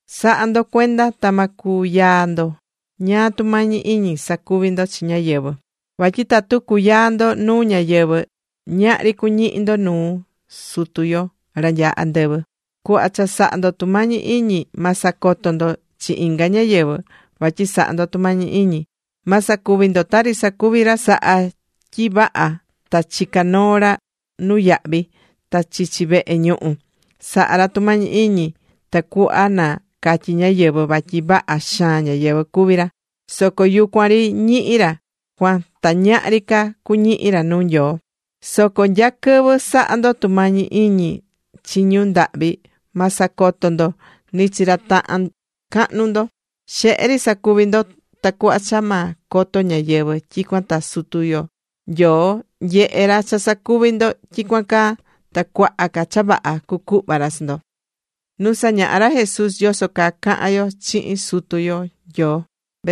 ’Sa̱ha ndo cuenda ta ma cuyaa ndo ñáá tumañi iñi sacuvi ndo chi ñáyɨvɨ. Vatyi tatu cuyaa ndo nuu ñáyɨvɨ, ñahri cuñihi ndo nuu Sutu yo ra nyaá andɨvɨ. Cuhva cha sahá ndo tumañi iñi, ma sacoto ndo chi inga ñáyɨvɨ vatyi sahá ndo tumañi iñi. Ma sacuvi ndo tari sacuví ra sahá tyi vaha ta chicá noo ra nuyahvi ta chichi vehe ñuhu. Sahá ra tumañi iñi tacuhva na catyi ñáyɨvɨ vatyi vaha xaan ñáyɨvɨ cuví ra. Soco yucuan ri ñihí ra cuan ta ñahri ca cuñihi ra nuu Nyoo. Soco nya quɨvɨ sahá ndo tumañi iñi chi ñu ndahvi, ma sacoto ndo ni chi ra tahan cahnu ndo. Xehe ri sa̱cuvi ndo, tacuhva cha ma coto ñáyɨvɨ. Tyicuan ta Sutu yo Nyoo nyehe ra cha sacuvi ndo tyicuan caa. Ta cuaha ca cha vaha cucuhva ra chi ndo.Nu sañahá ra Jesús yoso caa cahan yo chihin Sutu yo Nyoo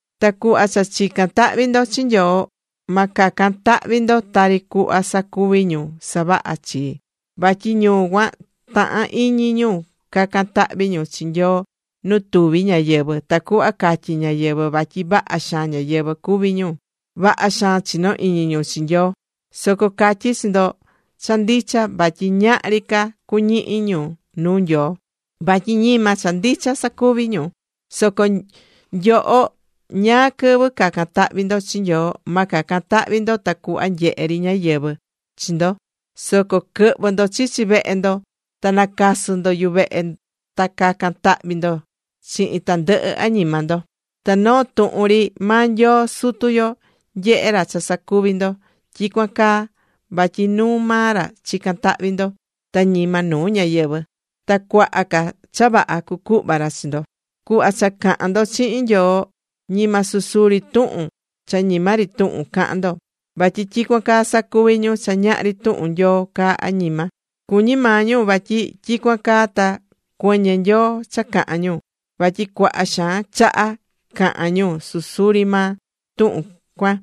’Ta cuhva cha chicán tahvi ndo chi Nyoo, ma cacan tahvi ndo tari cuhva sacuví ñu savahá chii. Vatyi ñu cuan tahán iñi ñu cacan tahvi ñu chi Nyoo nu tuvi ñáyɨvɨ, tacuhva catyi ñáyɨvɨ vatyi vaha xaan ñáyɨvɨ cuví ñu, vaha xaan chinó iñi ñu chi Nyoo. Soco catyí chi ndo cha ndicha vatyi ñahri ca cuñihi ñu nuu Nyoo. Vatyi ñima cha ndicha sacuví ñu. Soco nyoho ñáá quɨvɨ cacan tahvi ndo chi Nyoo, ma cacan tahvi ndo tacuhva nyehe ri ñáyɨvɨ chi ndo. Soco quɨ̱hvɨ ndo chichi vehe ndo ta na̱casɨ ndo yuvehe ta ca̱can tahvi ndo chihin tandɨhɨ añima ndo. Ta noo tuhun ri maa Nyoo Sutu yo nyehe ra cha sacuvi ndo tyicuan caa vatyi nuu maa ra chicán tahvi ndo, ta ñima nuu ñáyɨvɨ. Ta cuaha ca cha vaha cucuhva ra chi ndo. ’Cuhva cha cahán ndo chihin Nyoo ñima susuri tuhun cha ñima ri tuhun ca̱han ndo. Vatyi tyicuan caa sacuví ñu cha ñahri tuhun Nyoo caá añima. Cuñí maa ñu vatyi tyicuan caa ta cuɨñɨ Nyoo cha cahán ñu. Vatyi cuaha xaan chaha cahán ñu susuri maa tuhun cuan.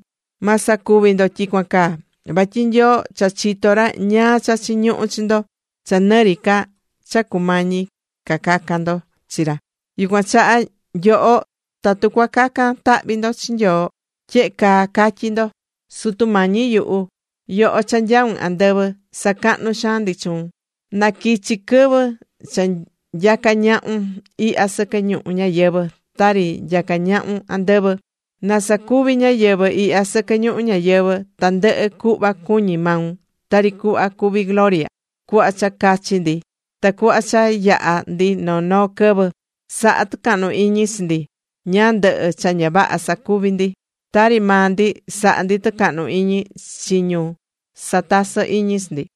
Ma sacuvi ndo tyicuan caa. Vatyi Nyoo cha chitó ra ñáá cha chiñuhú chi ndo, cha nɨ ri ca cha cumañi ca cacan ndo chi ra. Yucuan chaha nyoho, tatu cua cacan tahvi ndo chi Nyoo, tyehe caa ca̱tyi ndo: Sutu Mañi yuhu, yoho cha nyaún andɨvɨ. Sacahnú xaan ndi chuun. Na quichi quɨvɨ cha nyaca ñahun ihya sɨquɨ ñuhu ñayɨvɨ̱, tari nyacá ñahun andɨvɨ. Na sacuvi ñáyɨvɨ ihya sɨquɨ ñuhu ñayɨvɨ̱ tandɨhɨ cuhva cuñí maun, tari cuhva cuví gloria. Cu̱hva cha cachi ndi tacuhva cha yaha ndi noo noo quɨvɨ. Sa̱ha tucahnu iñi chi ndi ñáá ndɨhɨ cha ña vaha nyacuvi̱ ndi, tari maa ndi sahá ndi tɨcahnu iñi chi ñu satasɨ́ iñi chi ndi.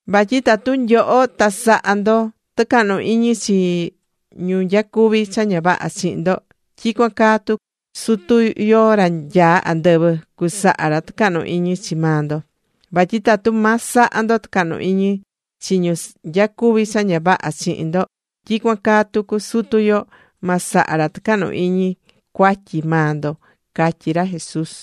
’Vatyi tatu nyoho ta sahá ndo tɨcahnu iñi chi ñu nyacuví cha ña vaha chihin ndo, tyicuan caa ta Sutu yo ra nyaá andɨvɨ, cusaha ra tɨcahnu iñi chi maa ndo. Vatyi tatu ma saha ndo tɨcahnu iñi chi ñu nyacuví cha ña vaha chihin ndo, tyicuan caa tucu Sutu yo, ma saha ra tɨcahnu iñi cuatyi maa ndo ―catyí ra Jesús.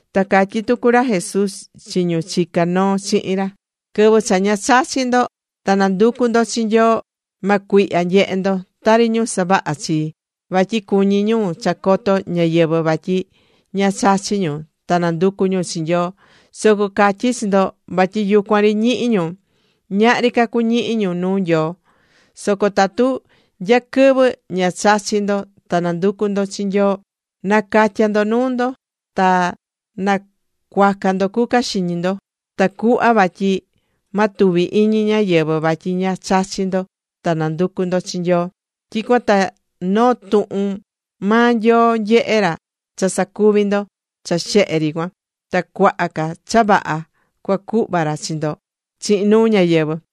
Ta catyí tucu ra Jesús chi ñu chicá noo chihin ra: ―Quɨvɨ cha ña chachí ndo ta nanducú ndo chi Nyoo, ma cuihya nyehe ndo, tari ñu savahá chii. Vatyi cuñí ñu cha coto ñáyɨvɨ vatyi ña chachí ñu ta nanducú ñu chi Nyoo. Soco catyí chi ndo vatyi yucuan ri ñihi ñu. Ñahri ca cuñihi ñu nuu Nyoo. Soco tatu nya quɨvɨ ña chachí ndo ta nanducú ndo chi Nyoo, na̱catya ndo nuu ndo. Ta na̱cuaca ndo cuca xiñi ndo, tacuhva vatyi ma tuvi iñi ñáyɨvɨ vatyi ña chachí ndo ta nanducú ndo chi Nyoo. Tyicuan ta noo tuhun maa Nyoo nyehe ra cha sacuví ndo cha xehe ri cuan. Ta cuaha ca cha vaha cua cuhva ra chi ndo chihin nuu ñáyɨvɨ.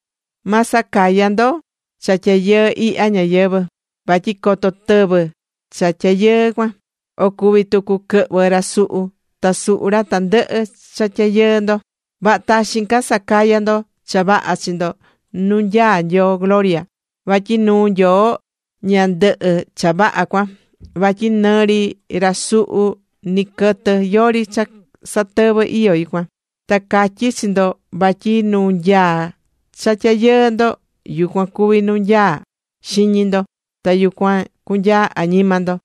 ’Ma sacaya ndo cha tyayɨɨ ihya ñayɨvɨ̱. Vatyi coto tɨvɨ cha tyayɨɨ cuan. O cuví tucu quɨhvɨ ra suhu, ta suhu ra tandɨhɨ cha tyayɨɨ ndo. Vaha taxin ca sa̱caya ndo cha vaha chi ndo nu nyaá Nyoo gloria. Vatyi nuu Nyoo ña ndɨhɨ cha vaha cuan. Vatyi nɨ ri ra suhu, nɨ quɨtɨ, yori cha satɨvɨ iyó yucuan. Ta catyí chi ndo vatyi nu nyaá cha tyayɨɨ ndo, yucuan cuví nu nyaá xiñi ndo. Ta yucuan cunyaa añima ndo.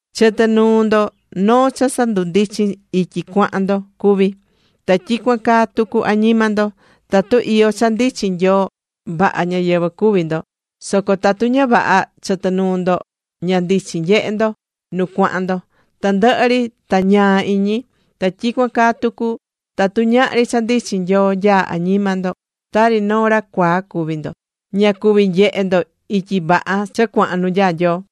’Chɨtɨ nuu ndo noo cha sandundichin ityi cuahan ndo cuví. Ta tyicuan caa tucu añima ndo, tatu iyó cha ndichin Nyoo, vaha ñáyɨvɨ cuví ndo. Soco tatu ña vaha chɨtɨ nuu ndo, ña ndichin nyehe ndo nu cuahan ndo. Tandɨhɨ ri ta ñaa iñi. Ta tyicuan caa tucu tatu ñahri cha ndichin Nyoo nyaá añima ndo, tari noo ra cuaa cuví ndo. Ña cuví nyehe ndo ityi vaha cha cuahan nu nyaá Nyoo.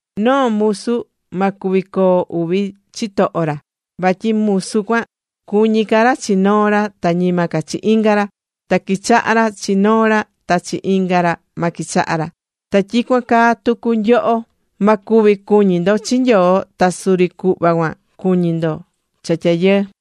’Noo musu ma cuvi coo uvi chitoho ra. Vatyi musu cuan cuñí ca ra chi noo ra ta ñima ca chi inga ra. Ta quichahá ra chi noo ra, ta chi inga ra ma quichaha ra. Ta tyicuan caa tucu nyoho, ma cuvi cuñi ndo chi Nyoo, ta suri cuhva cuan cuñí ndo cha tyayɨɨ.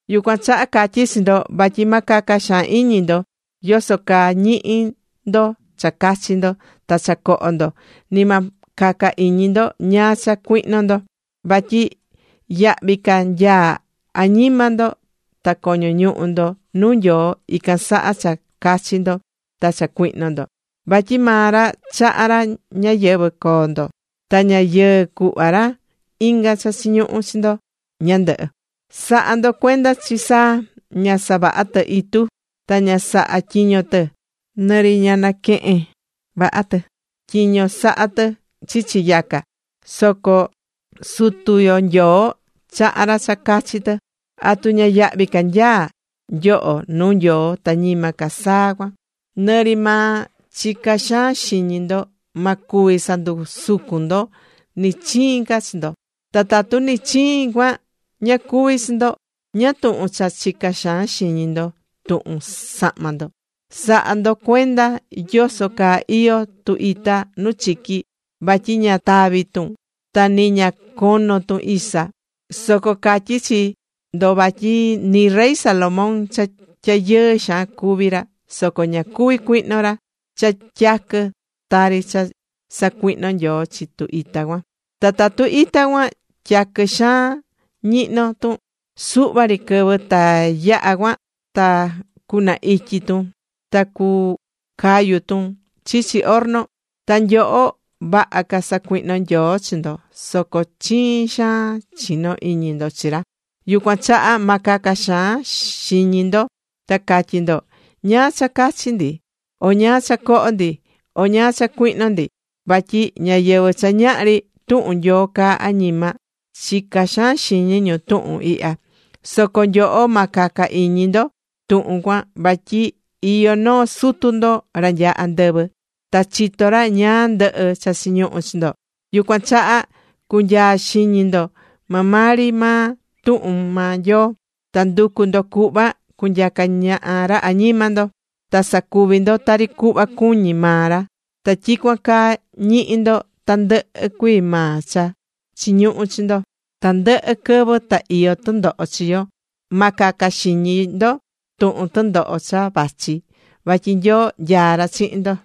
’Yucuan chaha catyí chi ndo vatyi ma caca xaan iñi ndo yoso caa ñihi ndo cha cachi ndo ta cha coho ndo. Nɨ ma caca iñi ndo ñáá cha cuihno ndo. Vatyi yahvi ca nyaá añima ndo ta coño ñuhu ndo nuu Nyoo, ican saha cha cachi ndo ta cha cuihno ndo. Vatyi maa ra chahá ra ñayɨvɨ̱ coo ndo. Ta ña yɨɨ cuhva ra inga cha chiñuhú chi ndo ñandɨhɨ. Sa̱ha ndo cuenda chi saa. Ña savahá tɨ itu. Ta ña sahá tyiño tɨ. Nɨ ri ña naquehén vaha tɨ tyiño sahá tɨ chichi yaca. Soco Sutu yo Nyoo chahá ra cha cachi tɨ. ¿Atu ña yahvi ca nyaá nyoho nuu Nyoo ta ñima ca saa cuan? Nɨ ri maa chicá xaan xiñi ndo ma cuvi sandusucun ndo nɨ chiin ca chi ndo. ’Ta tatu ni chiin cuan ña cuví chi ndo, ¿ñáá tuhun cha chicá xaan xiñi ndo tuhun sahma ndo? Sa̱ha ndo cuenda yoso caa iyó tu ita nu chiqui. Vatyi ña taví tun. Ta nɨ ña conó tun isa. Soco catyí chi ndo vatyi nɨ rey Salomón cha tyayɨɨ xaan cuvi̱ ra, soco ña cuvi̱ cuihno ra cha tyaquɨ, tari cha sacuihnó Nyoo chi tu ita cuan. Ta tu ita cuan tyaqui xaan ñihno tun suhva ri quɨvɨ ta yaha cuan ta cuna ityi tun ta cucayu tun chichi horno. Ta nyoho, vaha ca cusacuihno Nyoo chi ndo. Soco chiin xaan chinó iñi ndo chi ra. Yucuan chaha ma caca xaan xiñi ndo ta catyí ndo: “¿Ñáá cha cachi ndi, o ñáá cha coho ndi, o ñáá cha cuihno ndi?” Vatyi ñáyɨvɨ cha ñahri tuhun Nyoo caá añima, chicá xaan xiñi ñu tuhun ihya. Soco nyoho ma caca iñi ndo tuhun cuan vatyi iyó noo Sutu ndo, ra nyaá andɨvɨ. Ta chitó ra ñáá ndɨhɨ cha chiñuhu chi ndo. Yucuan chaha, cu̱nyaa xiñi ndo maa maa ri maa tuhun maa Nyoo. Ta ndu̱cu ndo cuhva cunyaca ñaha ra añima ndo. Ta sa̱cuvi ndo tari cuhva cuñí maa ra. Ta tyicuan caa ñihi ndo tandɨhɨ cuii maa cha chiñuhú chi ndo. Tandɨhɨ quɨvɨ ta iyó tɨndoho chi ndo. Ma caca xiñi ndo tuhun tɨndoho cha vachi. Vatyi Nyoo nyaá ra chihin ndo.